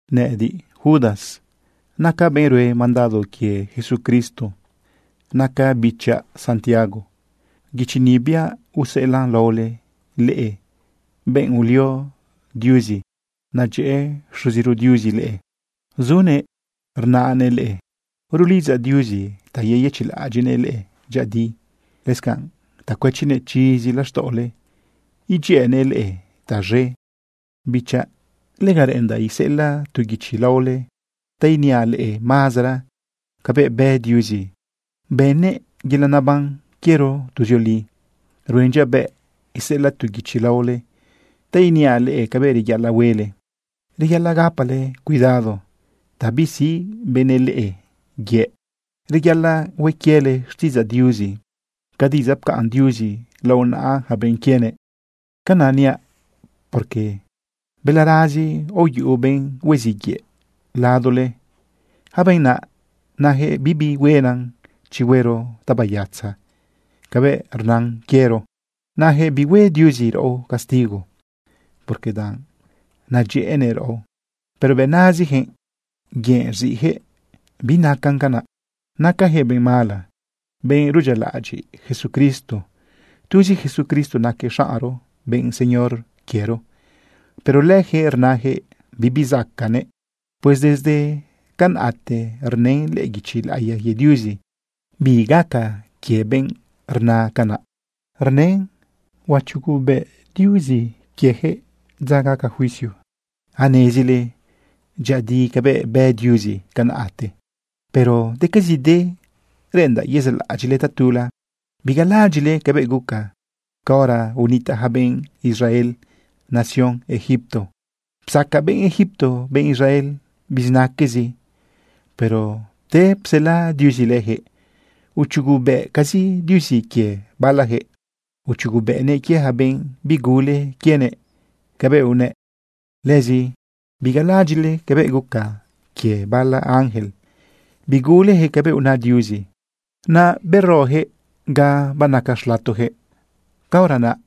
Nëꞌëdiꞌ, Judas, nacaꞌ benꞌ rue mandado quie Jesucristo. Nacaꞌ bichaꞌ Santiago. Guichi ni biaꞌ useꞌelaꞌn laole leꞌe, benꞌ ulio Diuzi. Nadyëꞌë Xuziro Diuzi leꞌe, zunëꞌ rnaꞌnëꞌ leꞌe. Rulidzaꞌ Diuzi ta yeyëchiꞌlaꞌadyiꞌnëꞌ leꞌe dyëꞌëdi, lëscanꞌ ta cuëchinëꞌ chizi laxtaꞌole idyëꞌënëꞌ leꞌe taz̃e. Bichaꞌ, lega reꞌendaꞌ iseꞌelaꞌ tu guichi laole ta iniaꞌ leꞌe mazara cabëꞌ bë Diuzi bënnëꞌ yelaꞌ neban quiero tuzioli. Ruen dyabëꞌ iseꞌelaꞌ tu guichi laole ta iniaꞌ leꞌe cabëꞌ reyaꞌalaꞌ huele, reyaꞌalaꞌ gapale cuidado ta bisiꞌ benëꞌ leꞌe yëꞌ. Reyaꞌalaꞌ hue quiele xtiꞌidzaꞌ Diuzi ca diꞌidzaꞌ pcaꞌn Diuzi lao naꞌa yaca benꞌ quienëꞌ. Canaꞌ niaꞌ, porque balarazi aoyuꞌu benꞌ hueziꞌ yëꞌ ladole. Yaca benꞌ naꞌ najëꞌ bibi huena chi huero tabayatza cabëꞌ rnan quiero. Najëꞌ bihue Diuzi raꞌo castigo, porque danꞌ nadyëꞌënëꞌ raꞌo. Pero bëꞌ nazijëꞌ yëꞌ rziꞌjëꞌ binacan canaꞌ. Nacajëꞌ benꞌ mala, benꞌ rudyialaꞌadyiꞌ Jesucristo. Tuzi Jesucristo naquëꞌ xaꞌnro, benꞌ Señor quiero. Pero lëjëꞌ rnajëꞌ bibi zacaꞌnëꞌ. Pues desde canaꞌte rnën lëꞌë guichi laꞌiya quie Diuzi bi gaca quie benꞌ rna canaꞌ. Rnën huachugubëꞌ Diuzi lëjëꞌ dza gaca juicio. Anezile dyëꞌëdi cabëꞌ bë Diuzi canaꞌte, pero decazide reꞌendaꞌ yezaꞌlaꞌadyiꞌle tatula. Bigalaꞌadyiꞌle cabëꞌ guca caora unitaꞌ yaca benꞌ Israel nación Egipto. Psaca benꞌ Egipto benꞌ Israel bizinaquezi, pero pte psela Diuzi lëjëꞌ, uchugubëꞌcazi Diuzi quie balajëꞌ. Uchugubëꞌnëꞌ quie yaca benꞌ bigule quienëꞌ cabëꞌ unëꞌ. Lëzi bigalaꞌadyiꞌle cabëꞌ guca quie bala ángel. Bigulejëꞌ cabëꞌ una Diuzi, naꞌ berojëꞌ ga banaca xlatojëꞌ. Caora naꞌ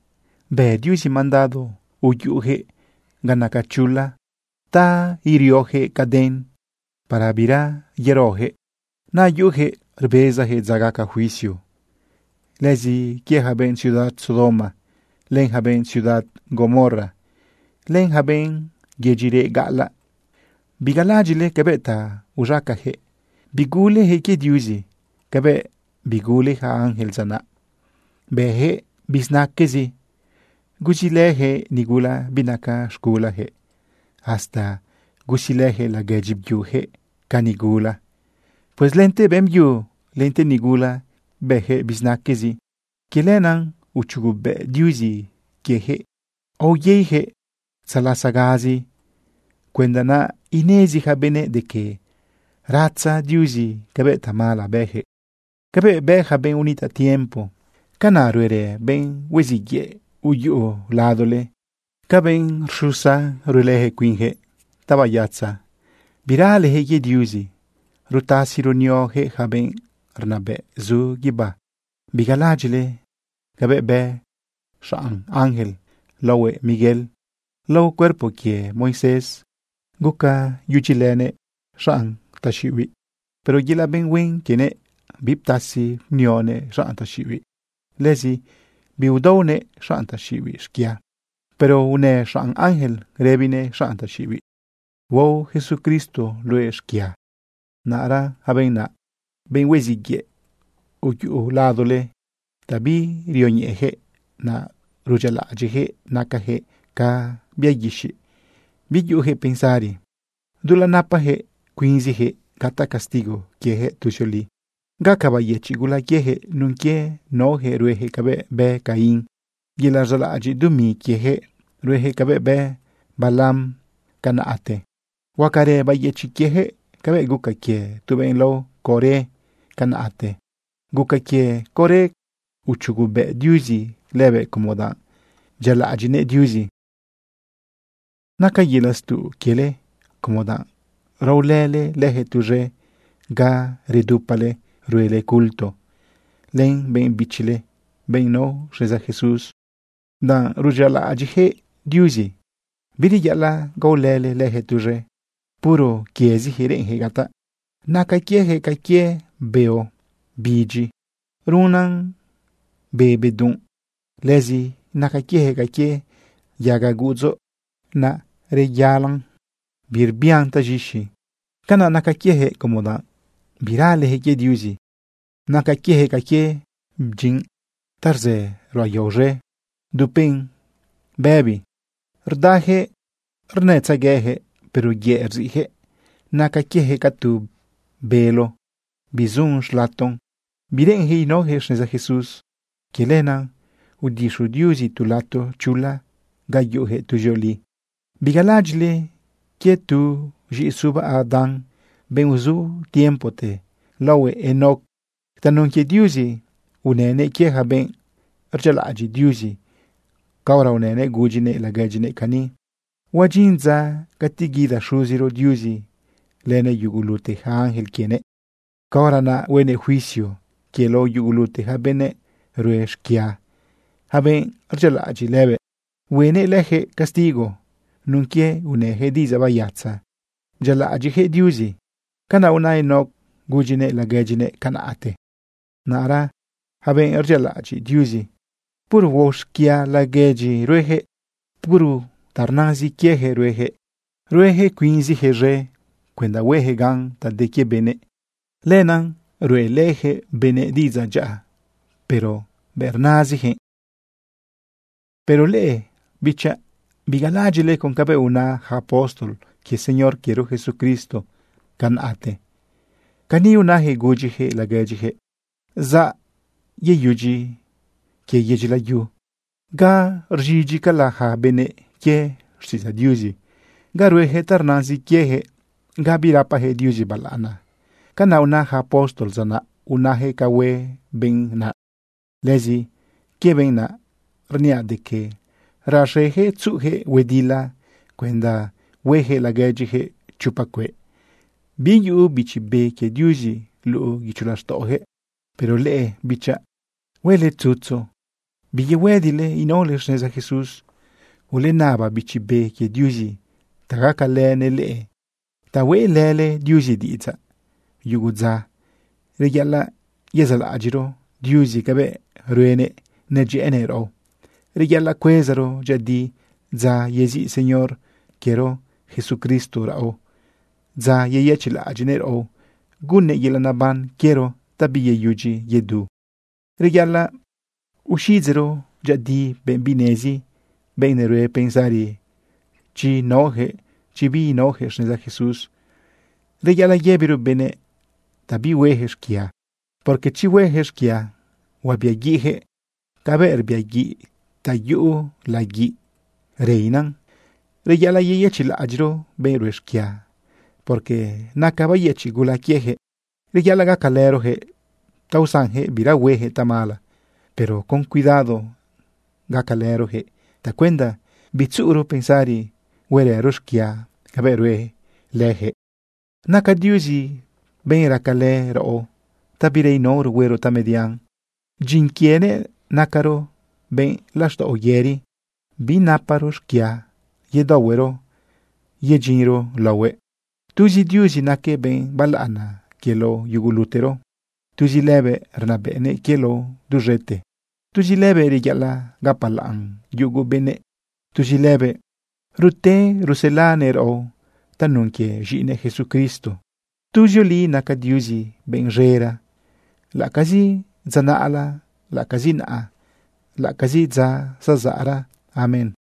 bë Diuzi mandado uyuꞌujëꞌ ga naca chula ta iriojëꞌ caden para bira yerojëꞌ. Naꞌ yuꞌujëꞌ rbezajëꞌ dza gaca juicio. Lëzi quie ja benꞌ ciudad Sodoma, len ja benꞌ ciudad Gomorra, len ja benꞌ yedyi reꞌ gaꞌalaꞌ, bigalaꞌadyiꞌle cabëꞌ ta uz̃acajëꞌ. Bigulejëꞌ quie Diuzi cabëꞌ bigule ja ángel dza naꞌ. Bëjëꞌ bizinaque, gusilëjëꞌ nigula binaca z̃gulajëꞌ, hasta gusilëjëꞌ laguedyi byujëꞌ ca nigula. Pues lente beꞌmbyu lente nigula bëjëꞌ bizinaquezi. Quie lenaꞌ uchugubëꞌ Diuzi quiejëꞌ, aoyeijëꞌ tzalasagazi cuenda naꞌ inezi yaca benëꞌ de que ratza Diuzi cabëꞌ tamala bëjëꞌ. Cabëꞌ bë ja benꞌ unitaꞌ tiempo, canaꞌ ruerë benꞌ hueziꞌ yëꞌ uyuꞌu ladole. Ca benꞌ xusa, ruelëjëꞌ cuinjëꞌ tabayatza. Biralejëꞌ quie Diuzi. Rutasi runiojëꞌ yaca benꞌ rnabëꞌ zu guibá. Bigalaꞌadyiꞌle cabëꞌ bë xanꞌ ángel laohuëꞌ Miguel. Lao cuerpo quie Moisés bëlënëꞌ xanꞌ taxiꞌibiꞌ huenë. Pero yelaꞌ benꞌ huen quienëꞌ, biptasi bnionëꞌ xanꞌ taxiꞌibiꞌ. Lëzi biudaonëꞌ xanꞌ taxiꞌibiꞌ xquia. Pero unë xanꞌ ángel rëbinëꞌ xanꞌ taxiꞌibiꞌ: “Huao Jesucristo luëꞌ xquia.” Naꞌra yaca benꞌ naꞌ, benꞌ hueziꞌ yëꞌ uyuꞌu ladole, ta birioñeꞌejëꞌ naꞌ rudyialaꞌadyiꞌjëꞌ. Nacajëꞌ ca bia guixiꞌ, biyuꞌujëꞌ pensari. Dulaꞌ napajëꞌ cuinzijëꞌ gataꞌ castigo quiejëꞌ tuzioli. Gaca bayëchiꞌ gula quiejëꞌ nun quie naojëꞌ ruejëꞌ cabëꞌ bë Caín. Yelaꞌ rzaꞌlaꞌadyiꞌ dumi quiejëꞌ, ruejëꞌ cabëꞌ bë Balaam canaꞌte. Huacarë bayëchiꞌ quiejëꞌ cabëꞌ guca quie tu benꞌ lao Coré canaꞌte. Guca quie Coré uchugubëꞌ Diuzi lëbëꞌ, como danꞌ bdyialaꞌadyiꞌnëꞌ Diuzi. Naca yelaꞌ stuꞌ quiele, como danꞌ raolële lëjëꞌ tuz̃e ga redupale ruele culto len benꞌ bichile, benꞌ nao xneza Jesús. Danꞌ rudyialaꞌadyiꞌjëꞌ Diuzi, bireyaꞌalaꞌ gaolële lëjëꞌ tuz̃e. Puro quiezijëꞌ reꞌenjëꞌ gataꞌ. Naca quiejëꞌ ca quie beo bidyi ruꞌunan be bedunꞌ. Lëzi naca quiejëꞌ ca quie yaga guꞌudzo naꞌ reyalan, birbian taz̃ixi. Canaꞌ naca quiejëꞌ, como danꞌ biralejëꞌ quie Diuzi. Naca quieyaquëꞌ ca quie bdyinꞌ ta rzë ruꞌa yao z̃e dupen bëbi. Rdayaquëꞌ rnëtzegueyaquëꞌ, pero yëꞌ rziꞌjëꞌ. Naca quieyaquëꞌ ca tu bélo bizun xlaton. Bireꞌenjëꞌ inaojëꞌ xneza Jesús. Quie lenaꞌ udixu Diuzi tu lato chula ga yuꞌujëꞌ tuzioli. Bigalaꞌadyiꞌle quie tu z̃iꞌisuba Adán, benꞌ uzu tiempote laohuëꞌ Enoc. Tanun quie Diuzi unënëꞌ quie ja benꞌ rdyialaꞌadyiꞌ Diuzi caora unënëꞌ gudyinëꞌ laguedyinëꞌ cani: “Huadyin dza cati guida Xuziro Diuzi lënëꞌ yugulute yaca ángel quienëꞌ. Caora naꞌ huenëꞌ juicio quie lao yugulute ja benëꞌ rue xquia, ja benꞌ rdyialaꞌadyiꞌ lëbëꞌ. Huenëꞌ lëjëꞌ castigo nun quie unëjëꞌ diꞌidzaꞌ bayatza bdyialaꞌadyiꞌjëꞌ Diuzi.” Canaꞌ una Enoc gudyinëꞌ laguedyinëꞌ canaꞌte. Naꞌra yaca benꞌ rdyialaꞌadyiꞌ Diuzi, puro huao xquia laguedyi ruejëꞌ. Puro ta rnazin quiejëꞌ ruejëꞌ. Ruejëꞌ cuinjëꞌ z̃e. Cuenda huejëꞌ gan ta de quie benëꞌ, lenaꞌ ruꞌelëjëꞌ benëꞌ diꞌidzaꞌ dyaꞌa, pero bëꞌ rnazijëꞌ. Pero leꞌe, bichaꞌ, bigalaꞌadyiꞌle con cabëꞌ una yaca apóstol quie Señor quiero Jesucristo canaꞌte. Cani unajëꞌ gudyijëꞌ laguedyijëꞌ: “Zaꞌ yeyudyi quie yedyi layu ga rz̃idyicala ja benëꞌ quie xtiꞌidzaꞌ Diuzi, ga ruejëꞌ ta rnazin quiejëꞌ, ga birapajëꞌ Diuzi balaꞌana.” Canaꞌ una yaca apóstol dza naꞌ, unayaquëꞌ ca hue benꞌ naꞌ. Lëzi quie benꞌ naꞌ rniaꞌ de que raxejëꞌ tzuꞌujëꞌ huedila cuenda huejëꞌ laguedyijëꞌ chopa cueꞌ. Biyuꞌu Bichi Be quie Diuzi luꞌu guicho laxtaꞌojëꞌ. Pero leꞌe, bichaꞌ, huele tzutzu biyehuëdile inaole xneza Jesús. Ulenaba Bichi Be quie Diuzi ta gacalënëꞌ leꞌe ta hueꞌlële Diuzi diꞌidzaꞌ. Yugu dza reyaꞌalaꞌ yezaꞌlaꞌadyiꞌro Diuzi cabëꞌ ruenëꞌ nadyëꞌënëꞌ raꞌo. Reyaꞌalaꞌ cuezaro dyëꞌëdi dza yeziꞌ Señor quiero Jesucristo raꞌo, dza yeyëchiꞌlaꞌadyiꞌnëꞌ raꞌo gunnëꞌ yelaꞌ naban quiero ta biyeyudyi yedu. Reyaꞌalaꞌ uxiꞌidzeꞌro dyëꞌëdi benꞌ binenezi, benꞌ nerue pensari chi naojëꞌ, chi biinaojëꞌ xneza Jesús. Reyaꞌalaꞌ yëbiro benëꞌ ta bihuejëꞌ xquia, porque chi huejëꞌ xquia, huabiaguiꞌjëꞌ cabëꞌ rbiaguiꞌ ta yuꞌu laguiꞌ reina. Reyaꞌalaꞌ yeyëchiꞌlaꞌadyiꞌro benꞌ rue xquia, porque naca bayëchiꞌ gula quiejëꞌ. Reyaꞌalaꞌ gacalërojëꞌ ta usanjëꞌ bira huejëꞌ tamala. Pero con cuidado gacalërojëꞌ tacuenda bitzuꞌuro pensari huerëro xquia cabëꞌ rue lëjëꞌ. Naca Diuzi benꞌ racalë raꞌo ta bira inaoro huero tamedian. Dyin quienëꞌ nacaro benꞌ laxtaꞌo yëri, binaparo xquia yedaohuero yedyinro laohuëꞌ. Tuzi Diuzi naquëꞌ benꞌ balaꞌana quie lao yugulutero. Tuzi lëbëꞌ rnabëꞌnëꞌ quie lao duz̃ete. Tuzi lëbëꞌ reyaꞌalaꞌ gapalaꞌn yugu benëꞌ. Tuzi lëbëꞌ rute ruselanëꞌ raꞌo tanun quie z̃iꞌinëꞌ Jesucristo. Tuzioli naca Diuzi benꞌ z̃era, laꞌacazi dza naꞌla, laꞌacazi naꞌa, laꞌacazi dza zazaꞌra. Amén.